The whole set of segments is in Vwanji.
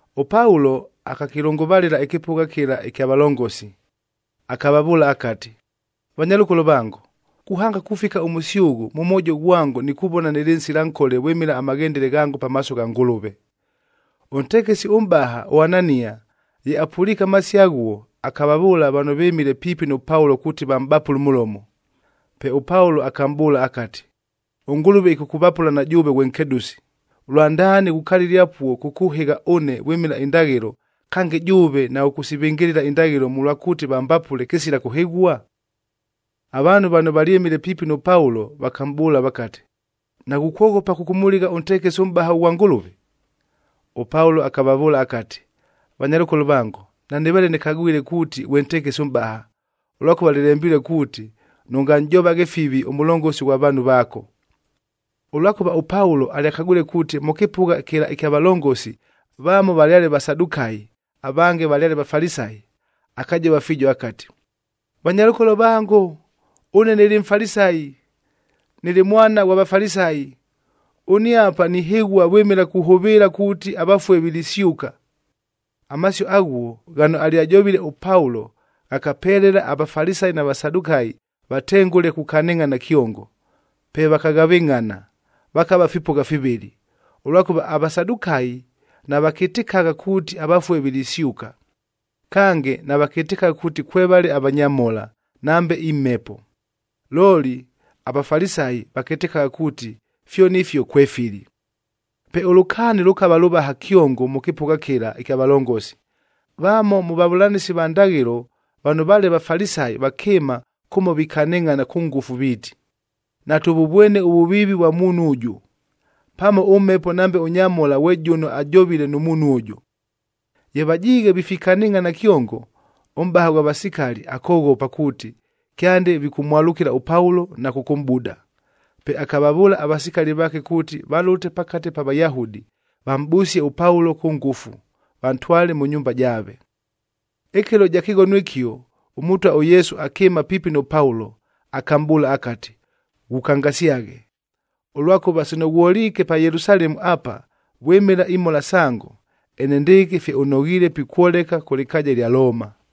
ɄPaulo akakɨlʉngʉvalɨla ɨkɨpʉgha kɨla ɨkya valongosi, akavavʉʉla akati, “Vanyalʉkolo vango, kuhanga kufika ʉmʉsyʉghʉ, mʉ mwojo ghwango nikuvona nɨlɨ nsila nkole vwɨmɨla amaghendele ghango pamaaso gha Ngʉlʉve.” Ʉntekesi ʉmʼbaha ʉAnania ye apʉliike amasio aghuo, akavavʉʉla vano vɨmile piipi nʉ Paulo kuuti vamʼbapʉle ʉmʉlomo. Pe ʉPaulo akamʼbʉʉla akati, “ɄNgʉlʉve ɨkʉkʉvapʉla na jʉʉve ghwe nkedʉsi.a Lwandaani ghukalile apuo kʉkʉhɨgha ʉne vwɨmɨla indaghɨlo, kange jʉʉve naghʉkʉsivɨngɨlɨla indaghɨlo mʉlwa kuuti vambapʉle kɨsila kʉhɨghua?” Avaanhu vano valyɨmile piipi nʉ Paulo vakamʼbʉʉla vakati, “Naghukwoghopa kʉkʉmʉligha ʉntekesi ʉmʼbaha ʉghwa Ngʉlʉve?” ɄPaulo akavavʉʉla akati, “Vanyalʉkolo vango, nanɨveele nɨkagwile kuuti ghwe ntekesi ʉmʼbaha, ʉlwakʉva lɨlembilue kuuti, ‘Nʉnganʼjovaghe fivi ʉmʉlongosi ghwa vaanhu vaako.’b” Ʉlwakʉva ʉPaulo alyakagwile kuuti, mʉ kɨpʉgha kɨla ɨkya valongosi vamo valyale Vasadukayi, avange valyale Vafalisayi,c akajova fiijo akati, “Vanyalʉkolo vango, ʉne nɨlɨ Mfalisayi, nɨlɨ mwana ghwa Vafalisayi. Ʉne apa nihɨghua vwɨmɨla kuhʉvɨɨla kuuti avafue vilisyʉka!” Amasio aghuo ghano alyajovile ʉPaulo ghakapelela aVafalisayi na Vasadukayi vatengʉle kukanɨngʼhana kyongo. Pe vakaghavɨngʼhana, vakava fipʉgha fivɨlɨ, ʉlwakʉva aVasadukayi navakɨtɨkagha kuuti avafue vilisyʉka, kange navakɨtɨkagha kuuti kwevale avanyamhola, nambe imhepo. Looli aVafalisayi vakɨtɨkagha kuuti fyoni ifio kwefili. Pe ʉlʉkaani lʉkava lʉvaha kyongo mʉ kɨpʉgha kɨla ɨkya valongosi. Vamo mʉ vavʉlanɨsi va ndaghɨlo vano vaale Vafalisayi vakɨɨma kʉmo vikanɨngʼhana kʉ ngʉfu viiti, “Natʉvʉvwene ʉvʉviivi ʉvwa muunhu ʉjʉ. Pamo ʉmhepo nambe ʉnyamhola ghwe jʉno ajovile nʉ muunhu ʉjʉ.” Ye vajiighe vifikanɨngʼhana kyongo, ʉmʼbaha ghwa vasikali akoghopa kuuti, kyande vikʉmwalʉkɨla ʉPaulo na kʉkʉmʼbuda. Pe akavavʉʉla avasikali vaake kuuti valʉte pakate pa Vayahudi, vamʼbʉsie ʉPaulo kʉ ngʉfu, vantwale mʉ nyumba jaave. Ɨkɨlo ɨja kɨghono ɨkio, ʉMʉtwa ʉYesu akɨɨma piipi nʉ Paulo akamʼbʉʉla akati, “Ghukangasyaghe! Ʉlwakʉva sino ghwoliike pa Yelusalemu apa vwɨmɨla imhola sango, enendɨɨkɨ fye ʉnoghiile pikwoleka kʉ lɨkaaja ɨlya Looma.”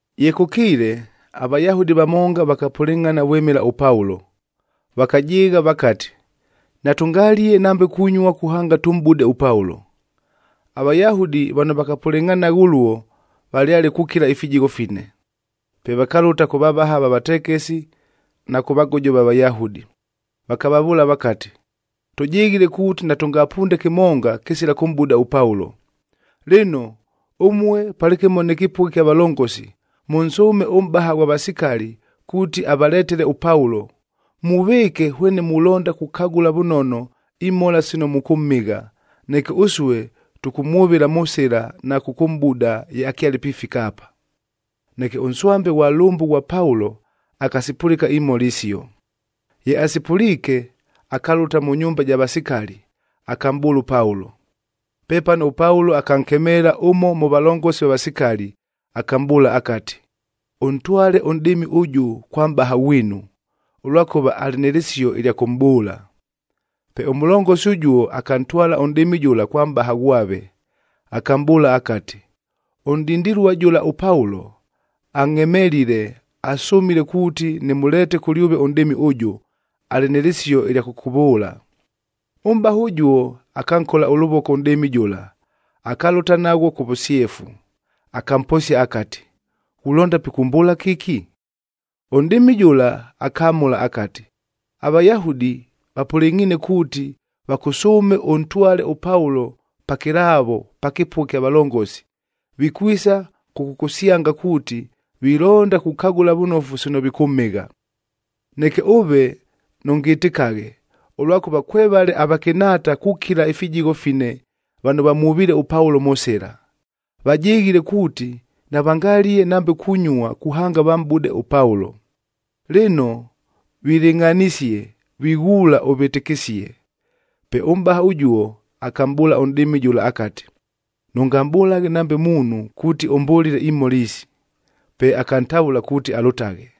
Ye kʉkiile, aVayahudi vamonga vakapʉlɨngʼhana vwɨmɨla ʉPaulo, vakajɨɨgha vakati, “Natʉngalie nambe kunyua kuhanga tʉmʼbude ʉPaulo.” AVayahudi vano vakapʉlɨngʼhanagha ʉluo valyale kukila ifijigho fine. Pe vakalʉta kʉ vavaha va vatekesi na kʉ vagojo va Vayahudi, vakavavʉʉla vakati, “Tʉjɨghile kuuti natʉngapunde kɨmonga, kɨsila kʉmʼbuda ʉPaulo. Lɨno, ʉmue palɨkɨmo nɨ kɨpʉgha ɨkya valongosi, mʉnsʉʉme ʉmʼbaha ghwa vasikali kuuti avaletele ʉPaulo. Muvɨɨke hwene mulonda kukagʉla vʉnono imhola sino mʉkʉmhɨgha, neke ʉsue tʉkʉmwʉvɨla mʉ sɨla na kʉkʉmʼbuda ye akyale pifika apa.” Neke ʉnswambe ghwa lʉmbʉ ghwa Paulo akasipʉlɨka imhola isio. Ye asipʉliike, akalʉta mʉ nyumba ɨja vasikali, akamʼbʉʉla ʉPaulo. Pepano ʉPaulo akankemeela ʉmo mʉ valongosi va vasikali, akamʼbʉʉla akati, “Ʉntwale ʉnʼdɨɨmi ʉjʉ kwa mʼbaha ghwinu, ʉlwakʉva alɨ nɨ lɨsio ɨlya kʉmʼbʉʉla.” Pe ʉmʉlongosi ʉjuo akantwala ʉnʼdɨɨmi jʉla kwa mʼbaha ghwave, akamʼbʉʉla akati, “Ʉnʼdindilua jʉla ʉPaulo, angʼhemelile, asʉmile kuuti nɨmʉleete kʉlyʉve ʉnʼdɨɨmi ʉjʉ, alɨ nɨ lɨsio ɨlya kʉkʉvʉʉla.” Ʉmʼbaha ʉjuo akankola ʉlʉvoko ʉnʼdɨɨmi jʉla, akalʉta naghwo kʉ vʉsyefu. Akamposia akati, “Ghulonda pikʉmbʉʉla kɨki?” Ʉnʼdɨɨmi jʉla akamʉla akati, “AVayahudi vapʉlɨngʼhiine kuuti, vakʉsʉʉme ʉntwale ʉPaulo pakɨlaavo pa kɨpʉgha ɨkya valongosi, vikwisa kʉkʉkʉsyanga kuuti, vilonda kukagʉla vʉnofu sino vikʉmhɨgha. Neke ʉve nʉngɨtɨkaghe, ʉlwakʉva kwevale avakɨnhaata kukila ifijigho fine vano vamwʉviile ʉPaulo mʉ sɨla. Vajɨghile kuuti navangalie nambe kunyua kuhanga vamʼbude ʉPaulo. Lɨno vilɨngʼhanisie, vighuula ʉvɨtɨkɨsie.” Pe ʉmʼbaha ʉjuo akamʼbʉʉla ʉnʼdɨɨmi jʉla akati, “Nʉngamʼbʉlaghe nambe muunhu kuuti ʉmbʉlile imhola isi.” Pe akantavʉla kuuti alʉtaghe.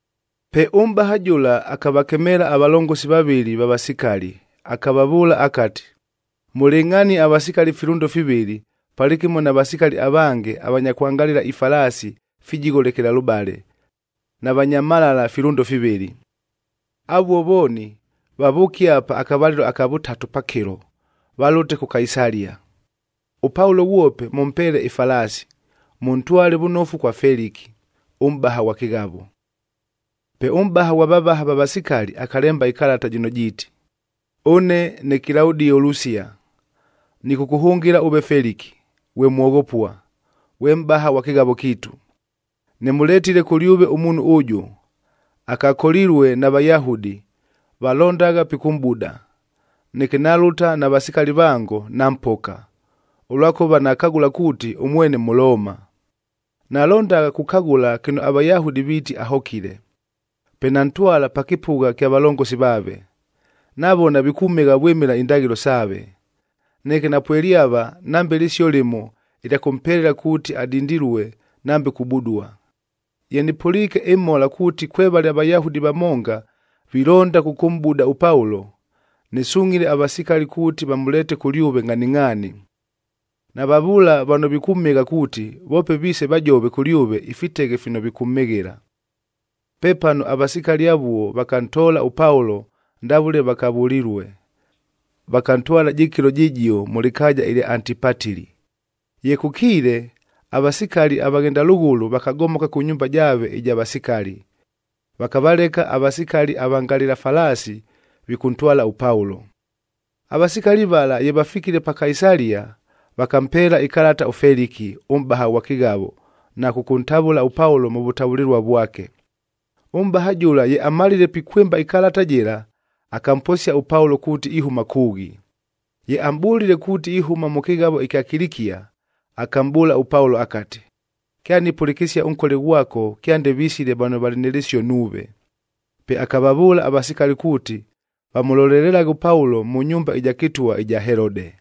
Pe ʉmʼbaha jʉla akavakemeela avalongosi vavɨlɨ va vasikali, akavavʉʉla akati, “Mʉlɨngʼhanie avasikali filʉndo fivɨlɨ, palɨkɨmo na vasikali avange avanya kwangalɨla ifalaasi fijigho lekelalʉbale, na vanya mhalala filʉndo fivɨlɨ. Avuo vooni vavʉʉke apa akavalɨlo aka vʉtatu pakɨlo, valʉte kʉ Kaisalia. ɄPaulo ghwope mʉmpeele ɨfalaasi, mʉntwale vʉnofu kwa Feliki, ʉmʼbaha ghwa kɨghavo.” Pe ʉmʼbaha ghwa vavaha va vasikali akalemba ɨkalata jɨno jiiti, “Ʉne ne Kilaudio Lusia, nɨkʉkʉhʉngɨla ʉve Feliki, ghwe mwoghopua, ghwe mʼbaha ghwa kɨghavo kiitu. Nɨmʉletile kʉlyʉve ʉmuunhu ʉjʉ, akakolilue na Vayahudi, valondagha pikʉmʼbuda. Neke nalʉta na vasikali vango, nampoka, ʉlwakʉva nakagʉla kuuti ʉmwene Mʉlooma. Nalondagha kukagʉla kɨno aVayahudi viiti ahokile, pe nantwala pa kɨpʉgha ɨkya valongosi vaave. Navona vikʉmhɨgha vwɨmɨla indaghɨlo saave. Neke napwelyava nambe lɨsio lɨmo ɨlya kʉmpelela kuuti adindilue nambe kubudua. Ye nɨpʉliike ɨmhola kuuti kwevale aVayahudi vamonga vilonda kʉkʉmʼbuda ʉPaulo, nɨsungʼhile avasikali kuuti vamʉleete kʉlyʉve ngʼhaningʼhaani. Navavʉʉla vano vikʉmhɨgha kuuti, voope viise vajove kʉlyʉve ifiteghe fino vikʉmhɨghɨla.” Pepano avasikali avuo vakantoola ʉPaulo ndavʉle vakavʉlilue, vakantwala jɨkɨlo jɨjio mʉ lɨkaaja ɨlya Antipatili. Ye kʉkiile, avasikali avaghenda lʉghʉlʉ vakagomoka kʉ nyumba jaave ɨja vasikali, vakavaleka avasikali avangalɨla falaasi vikʉntwala ʉPaulo. Avasikali vala ye vafikile pa Kaisalia, vakampeela ɨkalata ʉFeliki, ʉmʼbaha ghwa kɨghavo na kʉkʉntavʉla ʉPaulo mʉ vʉtavʉlɨlua vwake. Ʉmʼbaha jʉla ye amalile pikwɨmba ɨkalata jɨla, akamposia ʉPaulo kuuti ihʉma kʉʉghi. Ye amʼbʉlile kuuti ihʉma mʉ kɨghavo ɨkya Kilikia, akamʼbʉʉla ʉPaulo akati, “Kyanipʉlɨkɨsia ʉnkole ghwako kyande visile vano valɨ nɨ lɨsio nuuve.” Pe akavavʉʉla avasikali kuuti, vamʉlolelelaghe ʉPaulo mʉ nyumba ɨja kɨtwa ɨja Helode.